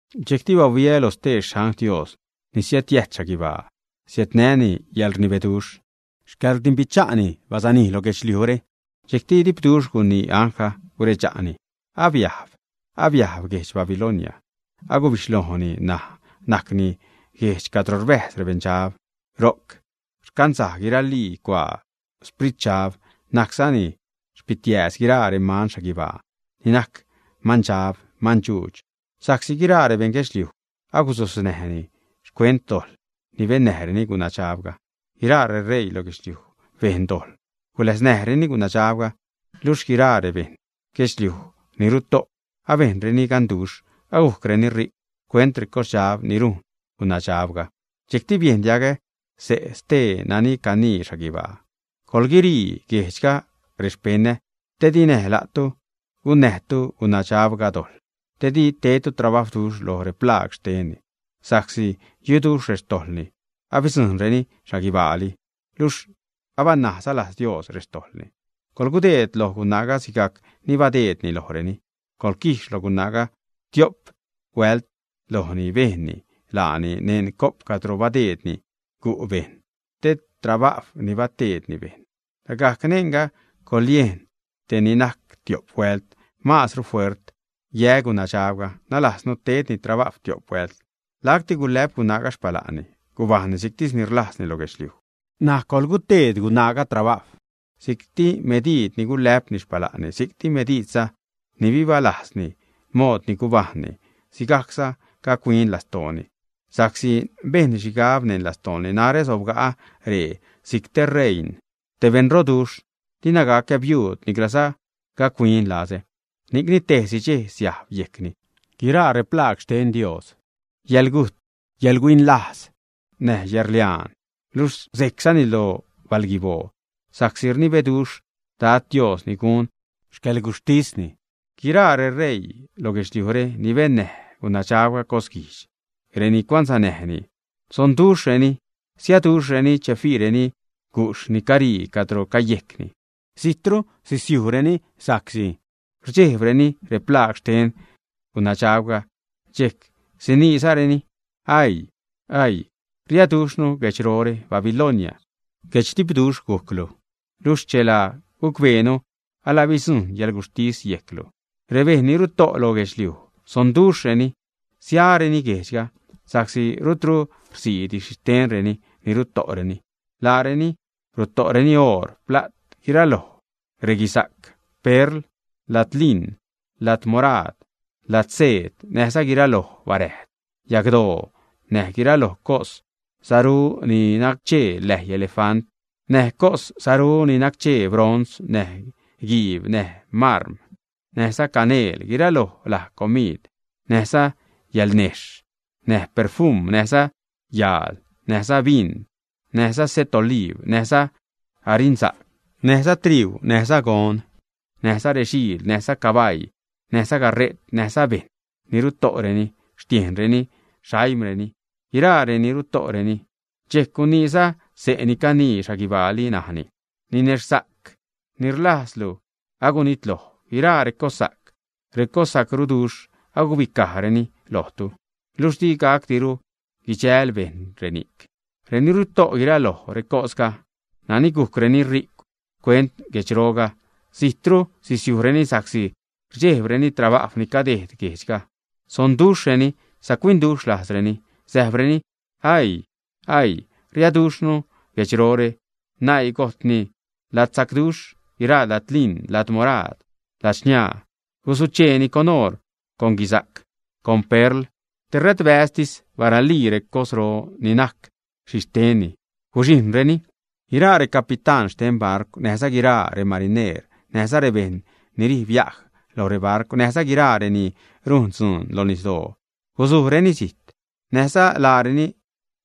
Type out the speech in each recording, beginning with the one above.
Dxejcti bahuiä loj stee xangl Dios ni siädyäjt xhaguibaa. Siädnäni yäḻrnibeduxh, xcäḻrdimbicha'ni bazanij loj guedxliujre. Dxejcti dipduxh gunii anglga, guredxa'ni: ―Abiajb, abiajb guedx Babilonia, agubixhlojni, ṉaj najcni guejdx cadro rbäjz rebeṉdxab, ro'c rcanzaj guiralii cuaa spritdxab, najczani xpitiääz guiraa reman xhaguibaa ni najc mandxab, mandxuudx. Sa'csi guiraa rebeṉ guedxliuj agusojzreni xcuent dojḻ ni bennäjreni gunadxabga, guiraa reṟeii loj guedxliuj bejn dojḻ guläsnäjreni gunadxabga, luxh guiraa rebeṉ guedxliuj ni ruto' abejnreni ganduxh, agujcreni ri'cw xcuent recosdxab ni rujn gunabdxabga. Dxejcti biejn diagä xse' stee nani canii xhaguibaa: ―Coḻguirii guejdxga rexpeṉä, te di näj la'tu gunnäjtu gunadxabga dojḻ, te di tedtu trabawduxh lo replaag xtenni. Sa'csi yuduxh rextojḻni, abidzujṉreni xhaguibaali, luxh abanajza lajz Dios rextojḻni. Coḻgudeed loj gunaaga sigajc ni badeedni lojreni. Coḻquijx loj gunaaga tio'pli huält lo ni bejnni laani. Neṉ co'p cadro badeedni gu' bejṉ (te trabajw ni bateedni bejṉ), lagajc neṉga coḻyejn te ni najc tio'p huält maazru fuert yä gunadxabga, nalajznu tedni trabajw tio'p huält. Lacti gulä'p gunaaga xpala'nni, gubajṉni si'ctis ni rlajzni lo guedxliuj. N̲aj coḻguteed gunaaga trabajw, si'cti mediid ni gulä'pni xpala'nni; si'cti mediidza ni bibalaznäjni mood ni gubajṉni, sigajcza gac-huin lastooni sa'csi bejnni xhigab neṉ lastooni: “Narä sobga'ä ree si'c te reiṉ, te beṉroduxh, dina gacä biuud, niclaza gac-huin lazä.” Ni'cni tejsi dxej siajb yejcni guiraa replaag xten Dios: yäḻgujt, yäḻhuin lajz, näj yäḻrliaan, luxh sejczani lo balguiboo, sa'csi rnibeduxh Dad Dios ni gun xcäḻguxhtisni. Guiraa reṟeii lo guedxliujre ni bennäj gunaadxabga cosguijdx, reni cuansanäjnini, sonduxhreni, siaduxhreni che fiireni gujxh ni carii cadro cayejcni. Zijtru sisiujreni sa'csi rdxejbreni replaag xten gunadxabga, dxejc siniizareni: ―Aii, aii, riaduxhnu guedxrore, Babilonia, guedxdipduxh gujclu, luxh chela gucbeenu, ala bidzujṉ yäḻguxhtis yejclu. Rebejṉ ni ruto' loj guedxliuj sonduxhreni, siareni guejdxga sa'csi rutru rsiidi xhixtenreni ni ruto'reni. Laareni ruto'reni oor, pla't, guiraloj reguisa'c, perl, ladliṉ, ladmuraad, ladseed, näjza guiraloj baräjd yagdoo, näj guiraloj cos saru, ni nacchee läi elefant, näj cos saru ni nacchee bronz, näj guiib, näj márm, näjza caneel, guiraloj laj comiid, näjza yalnejxh, näj perfum, näjza yaal, näjza bin, näjza se't oliib, näjza arinsa'c, näjza triuu, näjza gon, näjza rexiil, näjza cabaii, näjza gare't, näjza bejṉ ni ruto'reni tiejxhreni, xaimreni. Guiraa reni'c ruto'reni. Dxejc guniiza xse' ni canii xhaguibaali, najni: ―Ninexhsa'c ni rlazduxhlu, agunitloj. Guiraa recossa'c, recossaruduxh agubicajreni lojtu, luxh di gacdiru guidxäl bejṉ reni'c. Reni ruto' guiraloj recosga, nani gujcreni ri'cw xcuent guedxroga, zijtru sisiujreni sa'csi rdxejbreni trabajw ni cadeed guejdxga, sonduxhreni, sac-huinduxh lajzreni, säjbreni: ―Aii, aii, riaduxhnu guedxrore, naii gojtni ladsacduxh, guiraa ladliṉ, ladmuraad, ladxniaa, gusucheeni con oor, con guisa'c, con perl, tera'tbäztis baralii recosro ni najc xhixtenni, guxhijṉreni. Guiraa recapitán xte barcw, näjza guiraa remarineer, näjza rebejṉ ni rij biaj lo rebarcw näjza guiraa reni rujn dzuun lo nisdoo, gusujreni zijt, näjza laareni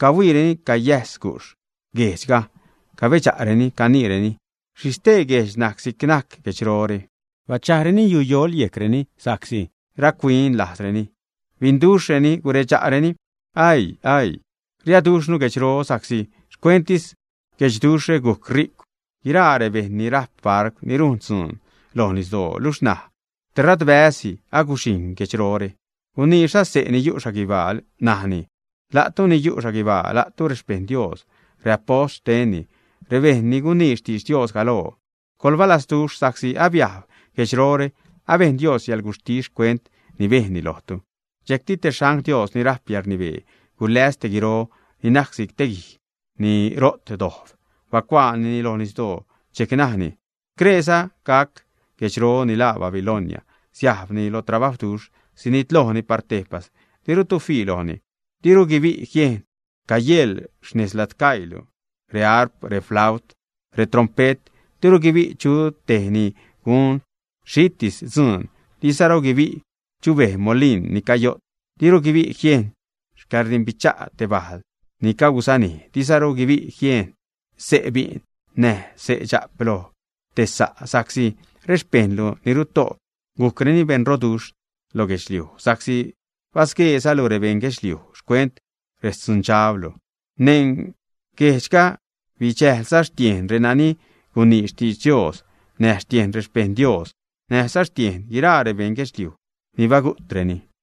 cahuiireni cayäjs gujxh guejdxga, cabedxa'reni, caniireni: ―¿Xhi stee guejdx najc si'c najc guedxrore, ä? Bachajreni yuyoḻ yejcreni sa'csi rac-huin lajzreni, binduxhreni, guredxa'reni: ―¡Aii! ¡Aii! Riaduxhnu guedxro sa'csi xcuenttis guedxduxhre gujc ri'cwduxh guiraa rebejṉ ni rajp barcw ni rujn dzuun loj nisdoo. Luxh ṉaj tera'tbäzsi aguxhijṉ guedxrore. Guniiza xse' ni yu' xhaguibaa, najni: ―La'tu ni yu' xhaguibaa, la'tu rexpejṉ Dios, reapost xtenni, rebejṉ ni gunii xtidx Dios galoo, coḻbalasduxh sa'csi abiajb guedxrore, abejn Dios yäḻguxhtis xcuent ni bejnni lojtu. Dxejcti te xangl Dios ni rajp yäḻrnibee, guläs te guiro ni najc si'c te guij ni ro't dojb, bacuaanini loj nisdoo, dxejc najni: ―Screeza gac guedxro ni laa Babilonia siajbni lo trabajwduxh, sinitlojni par tejpas, dirutu fii lojni. Diru guibi' jiejn cayeḻ nez xladcaiilu reharp, reflaut, retrompe't; diru guibi' chu tej ni gun xhitis dzuun; diruza guibi' chubej molin ni cayo't. Diru guibi' jieṉ xcäḻrdimbicha' te bajl ni cagusanij; diruza guibi' jiejn xse' bi'n näj dxa'p loj te sa' sa'csi rexpejṉlu ni ruto' gujcreni beṉroduxh lo guedxliuj sa'csi basgueezalu rebeṉ guedxliuj xcuent rextzundxablu. Neṉ guejdxga bidxäjlza xtiejn renani gunii xtidx Dios, näjza xtiejn rexpejṉ Dios, näjza xtiejn guiraa rebeṉ guedxliuj ni bagu'treni.